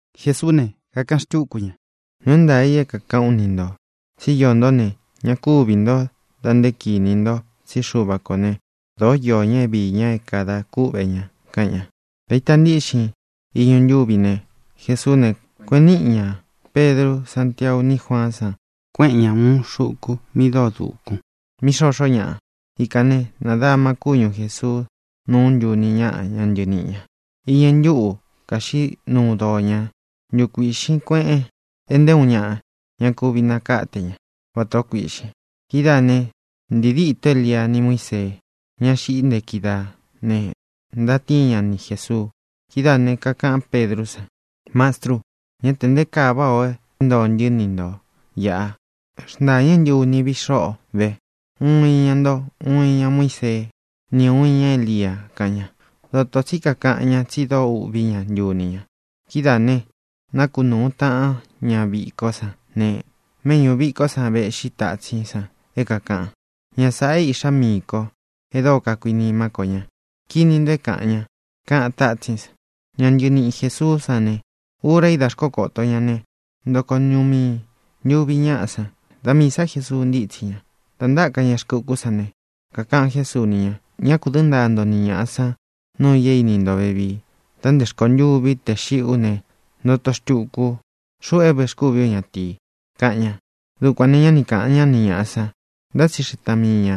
Jesuú ne, kakaꞌan xtúku ña: —Nuu é ntaā i é kākaꞌán u ni ntō tsí iō ntó ne, ña kúvī ntó da nté kinī nto tsí Xuva kō né, dōó iō ña é viī ña é kadā kúꞌvē ña —kaꞌan ña. Dā ita ntíꞌxin iñu ntúvi ne, Jesuú ne, kueꞌen níꞌi ñā Pedru, Sántiau ní Juaán san, kuéꞌen ña ūun xuku mi dóo dūkun, mí xoxó ñaꞌa. Ikān né, nādama kúñu Jēsuu núu ntuni ñáꞌa, ñá ntɨniꞌi ñā. Īñɨ ntúꞌu kāxiꞌí nuu doo ña. Ntukuiꞌxīn kueꞌen, e nté uun ñaꞌa ña kuvi nakáte ña vatā ó kuīꞌxin. Kidáā né, ntīi dîtó Elia ni Muísee, ña xiꞌí nte kídaā, ne, ntatíin ña ni Jēsuu. Kidáā ne, kakaꞌán Pedrú san: —Mastru, ¡ñá tē nté kaa váꞌā o é ntoo ntɨ́ ni ntō iꞌa! Xntāñɨ́ ntɨ uni viꞌi xóꞌo vē: uun iña nto, uun iña Muíseé, ni ūun iña Élia —kaꞌan ña. Dotō tsí kakaꞌan ñá, tsi dóo uꞌvī ñá, ntuni ña. Kidáā ne, nákunūu taꞌán ña vikó san ne, méꞌñū vikó san véꞌxi tatsín san é kākaꞌan: —Ña sāꞌa é Iꞌxá miī ko e dóo kakuinimá ko ña. Kīni nto é kāꞌan ña —kaꞌan tátsín san. Ña ntɨniꞌi Jēsuú san ne, ura í da xkókōto ña ne, ntoko ñuꞌu mii ntuvi ñáꞌa san. Da miī sá Jesuu ntítsi ña. Dā ntáka ña rkɨ ukú san ne, kakaꞌan Jésuu ni ña: —Ñá kū dɨ́ ntaa nto ni ñāꞌa san nuu i é ini nto vevii da nte rkontûví tē xiꞌí u ne, ntoto xtuku ú, xuꞌu é vēxkúvi ú ñatīi —kaꞌan ña. Dukuān ne, ñá ni kāꞌan ñá ni ñāꞌa san, ntá tsi tsixeꞌe taꞌan mii ñā,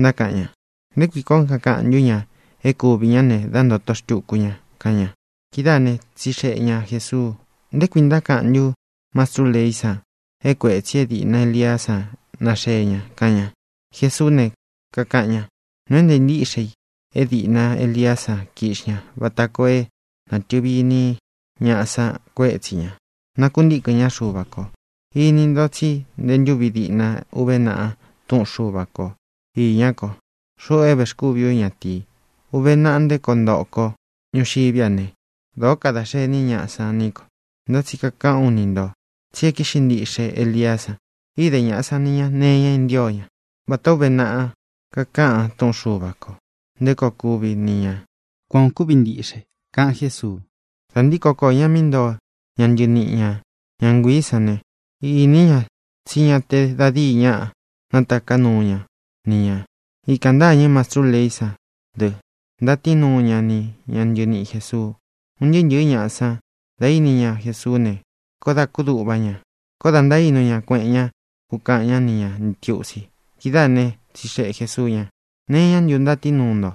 ntákaꞌan ña: —¿Nté kui kuān ó kakaꞌan ntú ña é kuvī ñá ne, dá ntōto xtuku ña? —kaꞌan ña. Kidáā né, tsixeꞌe ña Jēsuu: —¿Nté kui ntákaꞌan ntú mastrú leí san é kuētsi é dīꞌna Eliá san naxee ña? —kaꞌan ña. Jesuú ne, kakaꞌan ña: —Nuu é ntāa ntíꞌxe i é dīꞌna Eliá san kiꞌxi ña vata koo é nātɨvi iní ñaꞌa san kuétsi ñā, nakuntíkɨ̄n ñá Xuva kō. Ini nto tsí nte ntúvi diꞌna uve naꞌa Túꞌun Xuva ko īñá ko, xuꞌu é vēxkúvi ú ñatīi. Uve naꞌa nté koo ntoꞌo ko ñuxiví a ne, dōó kada xení ñaꞌa san ní ko. Ntá tsi kakaꞌán u ni ntō tsí e kíꞌxi ntiꞌxe Eliá san. Īde ñaꞌa san ni ña nee iña é ntio ña, vatā ó uve naꞌa kakaꞌan túꞌun Xuva kō nté koo kuvi ni ñā. Kuan ō kúvi ntiꞌxe —kaꞌan Jésuu. Dā ntíko koō ña mí ntoo ña ntɨniꞌi ña, ña nguiī sán ne, īní ña tsí ña te da díi ñaꞌa nátaká nuu ña ni ñā. Ikān ntâñɨ́ mastrú leí san dɨ, ntatíin nuu ña ni ña ntɨniꞌi Jēsuu. Un ntɨɨ́ ntɨ̄ɨ́ ñaꞌa san, da íni ña Jesuú ne, koó dā kúduꞌva ña. Koó dā ntaínu ña kueꞌen ña, kukaꞌan ñá ni ñā ntiusi. Kidáā né, tsixeꞌe Jēsuu ña: —¿Nee iñá ntu ntatíin nuu nto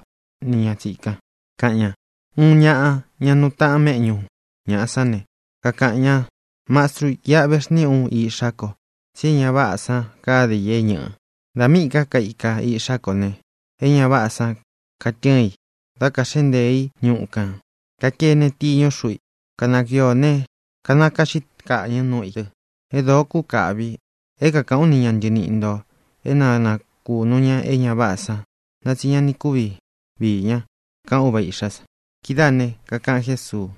ni ña tsīkan? —kaꞌan ña. Uun ñaꞌa, ña nuu taꞌan méꞌñū ñaꞌa sán ne, kakaꞌan ña: —Mastru, iꞌa vexníꞌi ú iꞌxá ko, tsí e ña váꞌā san káde i é ñɨꞌɨ̄. Da míꞌī ká kaika iꞌxá ko ne, e ña váꞌā san katɨ́ɨn i, da kaxéꞌe ntēe í ñuꞌu kān. Kakēne tiñú xuꞌu i. Kanakuiō ne, kanakaꞌxí kaꞌñɨ̄ núꞌu ī dɨ. É dōo kúkāꞌvi. É kākaꞌán u ni ña ntɨniꞌi ntō é na nakūnu ña é ña váꞌā san, ntá tsi ña ni kuvi vií ña —kaꞌan úva īꞌxá san. Kidáā ne, kakaꞌan Jésuu: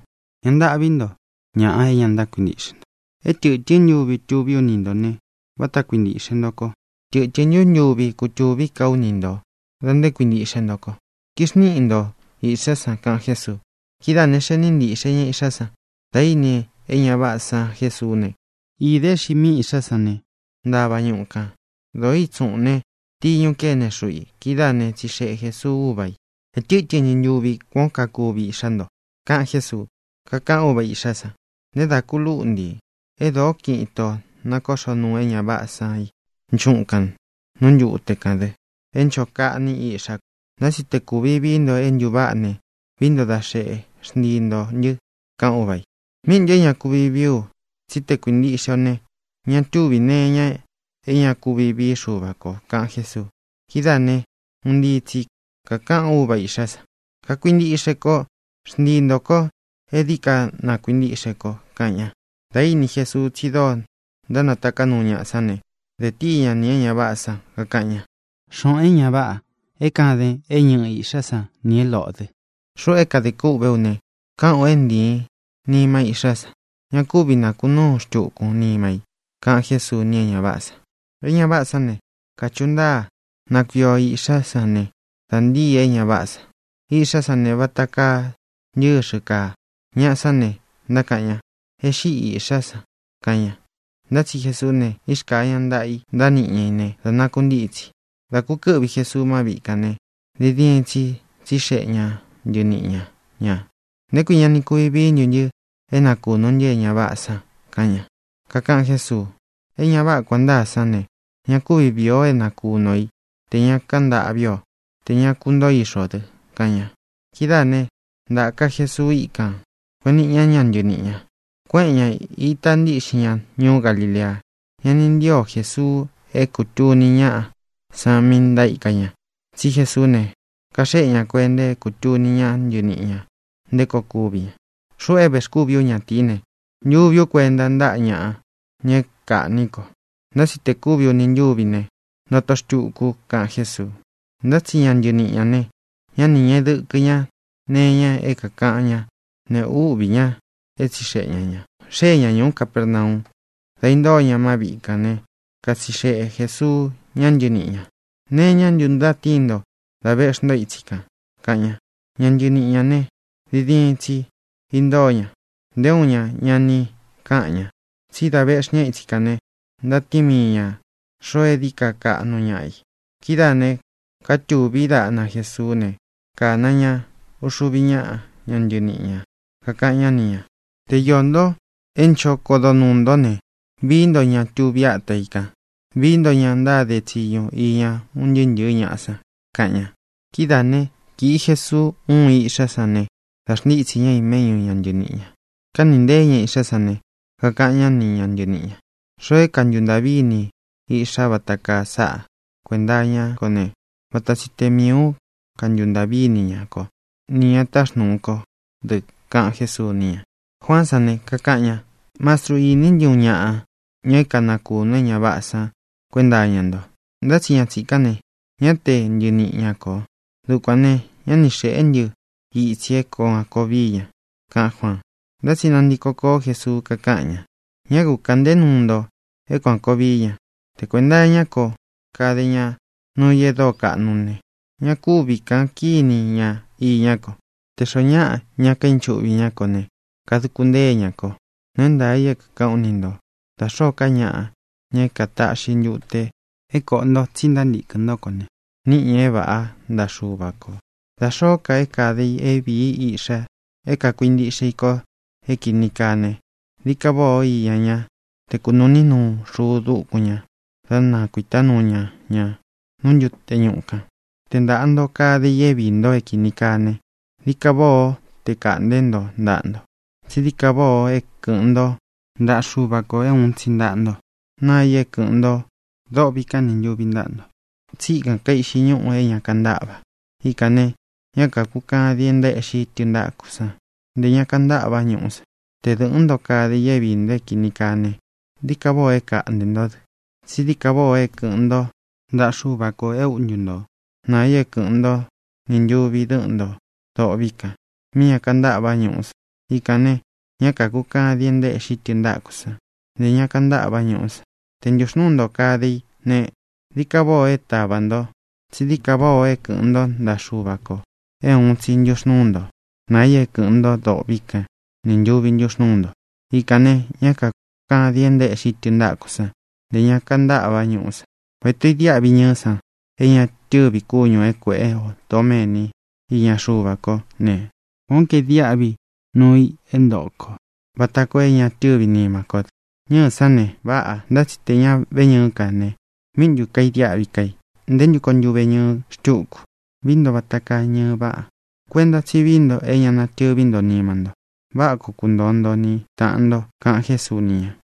—¡Ña ntâꞌví nto, ñaꞌa é ña ntákuintiꞌxe nto! É tɨ̄tɨ́n ntuvi tuví u ni ntō ne, váta kuintīꞌxe nto ko. ¿Tɨtɨ̄n ntú ntuvi kutuví ka ú ni ntō da nté kuīntiꞌxe nto ko? Kixniꞌi nto īꞌxá san —kaꞌan Jésuu. Kidáā ne, xee níꞌi ntīꞌxe ña iꞌxá san. Dā íni e ña váꞌā san Jesuú ne, īde é xiꞌi míi iꞌxá san ne, ntáva ñuꞌu kān. Dōó itsuꞌūn ne, tiñu kéne xuꞌu i. Kidáā né, tsixeꞌe Jēsuu úva ī: —¿Ē tɨ́tɨn ntu ntuvi kuán ó kakuvi iꞌxá nto? —kaꞌan Jésuu. Kakaꞌan úva īꞌxá san: —Nté dā ku lúꞌntī. É dōó kiꞌin itō nakóꞌxo nuu é ña váꞌā san i nchúꞌun kān, nú ntute kān dɨ, é ncho kaꞌní iꞌxá ko. Ntá tsi te kūvi vií nto é ntūváꞌa ne, vií nto da xeꞌé, xntii ntō ntɨ —kaꞌan úva ī. —¡Míꞌi ntū é ña kuvi vií u! tsí te kākuintiꞌxe o ne, ña túvī nee iña é ña kuvi vií Xuva kō —kaꞌan Jésuu. Kidáā ne, un ntii tsi kākaꞌan úva īꞌxá san: —¡Kakuintiꞌxe ko! ¡Xntii ntō ko é dií ka na kuīntiꞌxe ko! —kaꞌan ña. Dā íni Jesuu tsi dóo ntánataká nuu ñaꞌa sán ne, de tíi ña nī é ña váꞌā san, kakaꞌan ña: —Xōꞌon, é ña váꞌā é kaden é ñɨꞌɨ īꞌxá sa nī é loꞌō dɨ́, xuꞌu é kadē kûꞌvé u ne, káꞌān u é ntīin nima íꞌxá san. Ña kúvi nakunúun xtukun nima i —kaꞌan Jésuu ni é ña váꞌā san. E ña váꞌā sán ne, kachuꞌu ntáa. Nākuio iꞌxá san ne, dā ntíi e ña váꞌā san. Iꞌxá san ne, vata kaa ntɨ́xɨ kāa. Ñaꞌa sán ne, ntákaꞌan ña: —¡E xíꞌi īꞌxá san! —kaꞌan ña. Ntá tsi Jesuú ne, írkāa ña ntaꞌa i, ntániꞌi ña i ne, da nakuntítsi. Dá kūkɨ́ꞌvi Jesuu má viꞌi kān ne, diin diin tsi tsixeꞌe ña ntɨniꞌi ña ñā: —¿Nté kui ña ni kuvi vií ntu ntɨ é nakūnu ntɨ é ña váꞌā san? —kaꞌan ña. Kakaꞌan Jésuu: —E ña váꞌā é kuān ntáa sán ne, ña kúvi vīi o é nakūnu o í tē ña káꞌan ntaꞌví ō, tē ña kuntoó ixu ō dɨ —kaꞌan ña. Kidáā né, ntāka Jesuu íkān, kueꞌen níꞌi ña ña ntɨniꞌi ñā. Kuéꞌen ñā, ítā ntiꞌxin ña ñuú Galilea. Ña ni ntío Jesuu é kūtuni ñaꞌa san mí ntaíka ña. Tsí Jesuú ne, kaxéꞌe ña kuenta é kūtuni ñá ntɨniꞌi ñā nté koo kuví ña: —Xuꞌu é vēxkúvi ú ñatīí ne, ntuví u kuenta ntáꞌa ñaꞌa, ña é kāꞌní ko. Ntá tsi tē kúvi uni ntúvi xiꞌí u ne, ntoto xtuku u —kaꞌan Jésuu. Ntá tsi ña ntɨniꞌi ñā ne, ñá nī ñeꞌe dɨkɨ ña nee iña é kākaꞌan ñá, ne, úꞌvī ña é tsixeꞌe ña ñā. Xée ñā ñuú Capernau. Dā intóo ña má viꞌi kān né, katsixeꞌe Jēsuu ña ntɨníꞌi ñā: —¿Nee iñá ntu ntatíin nto dá vēꞌxi o itsi kan? —kaꞌan ña. Ña ntɨniꞌi ñā ne, diin diin tsi intóo ña; nté uun ña ña ni káꞌan ñā. Tsi dá vēꞌxí ña itsi kān ne, ntatíin mii ñā xoo é dií ka kaꞌnu ñaꞌa i. Kidáā ne, katuví daꞌna Jēsuú ne, kāna ña uxuvi ñáꞌa, ña ntɨniꞌi ñā, kakaꞌan ñá ni ñā: —Te iō nto é ncho kodo nuū ntó ne, vií nto ña tuví ata i kān. Vií nto ña ntáde tsiñu iña un ntɨɨ́ ntɨ̄ɨ́ ñaꞌa san —kaꞌan ña. Kidáā né, kīꞌi Jesuu uun iꞌxá san ne, dā xntítsī ñá i méꞌñu ña ntɨniꞌi ñā. Kánīꞌi nteé ña iꞌxá san ne, kakaꞌan ñá ni ña ntɨniꞌi ñā: —Xoo é kantuntāꞌví ini i iꞌxá vata kaa sáꞌa kuenta iñá ko ne, vata tsi te miī ú kantuntāꞌví ini ña kó, ni ñā táxnūu kó dɨ —kaꞌan Jésuu ni ña. Juaán san ne, kakaꞌan ña: —Mastru, iní ntɨ uun ñaꞌa, ña é kanakūnu é ña váꞌā san kuenta iña nto. Ntá tsi ña tsīkán ne, ñá te ntɨniꞌi ña kō. Dukuān ne, ñá ni xēꞌé ntɨ itsi é kuān koo vií ña —kaꞌán Juaan. Ntá tsi nantiko koó Jesuu, kakáꞌan ña: —Ñá ku kāꞌnté nuu nto é kuān koo vií ña. Te kuēnta iñá ko kade ña nuu i e dóo kaꞌnu ne, ña kúvi kāꞌan kíni ña iñá ko. Tē xoó ñaꞌa ña kainchuꞌvi ñá kō ne, kaduku ntée ña kō. Nuu é ntaā i é kākaꞌán u ni ntō. Da xōó ka ñaꞌa, ña é kataꞌxi ntute é kōꞌo nto tsí ntántīkɨn ntó ko ne, níꞌi ñā é vāꞌá ntaꞌa Xuva kō. ʼDa xōó ka é kade i é vīi iꞌxa é kākuintiꞌxe i ko é kīni kaa ne, dií ka váꞌā o iña ñá te kunūꞌní nuu xuu dúkun ñā, dá nakuītá nuu ña ña nú ntute ñuꞌu kān. Te ntāꞌa nto kade i é viī nto é kīni kaa ne, dií ka váꞌā ó te kaꞌntē ntó ntaꞌa nto. Tsí dií ka váꞌā o é kɨ̄ꞌɨn ntó ntaꞌa Xuva kō é ūun tsi ntaꞌa nto, naa i é kɨ̄ꞌɨn nto dôꞌvi kán nī ntuvi ntáꞌa nto, tsí ikān kaiꞌxi ñúꞌū é ña kantáꞌva. Ikān né, ñá kākukadin é ntaéꞌxi tɨntákū san; ntē ña kantáꞌva ñúꞌú san. Te dɨ̄ꞌɨ́n nto kade i é viī nto é kīni kaa ne, dií ka váꞌā o é kaꞌntē ntó dɨ. Tsí dií ka váꞌā o é kɨ̄ꞌɨn ntó ntaꞌa Xuva kō é uꞌntu nto, naa i é kɨ̄ꞌɨn ntó nī ntuvi dɨ́ꞌɨn ntō dôꞌvi kan, mí ña kantáꞌva ñúꞌú san. Ikān ne, ñá kākukadin é ntaéꞌxi tɨntákū san; ntē ña kantáꞌva ñúꞌú san. Te ntuxnūú nto kade i ne, dií ka váꞌā o é tāva nto. Tsí dií ka váꞌā o é kɨ̄ꞌɨn ntó ntaꞌa Xuva kō é ūun tsi ntúxnūú nto, naa i é kɨ̄ꞌɨn nto dôꞌvi kán nī ntuvi ntúxnūú nto. Ikān ne, ñá kākukadin é ntaéꞌxi tɨntákū san; ntē ña kantáꞌva ñúꞌú san. ʼVatā ó idiáꞌvi ñɨɨ́ san é ña tɨ́vi kúñū é kuēꞌe o doméni iña Xuva kó ne, kuān ó kaidiáꞌvi nuu i é ntoꞌo kō, vata koo é ña tɨ́vi nima kó dɨ. Ñɨ́ɨ̄ sán ne, váꞌā. Ntá tsi tē ña véñɨɨ́ ka ne, ¿míꞌi ntū kaidiáꞌvi ká i? ¿Nté ntu koo ntuveñɨɨ xtúku? Vií nto vata kaa ñɨɨ váꞌa. Kuenta tsí vií nto é ña natɨví nto nima nto. Váꞌa koo kuntoo nto ni tāꞌan nto —kaꞌan Jésuu ni ña.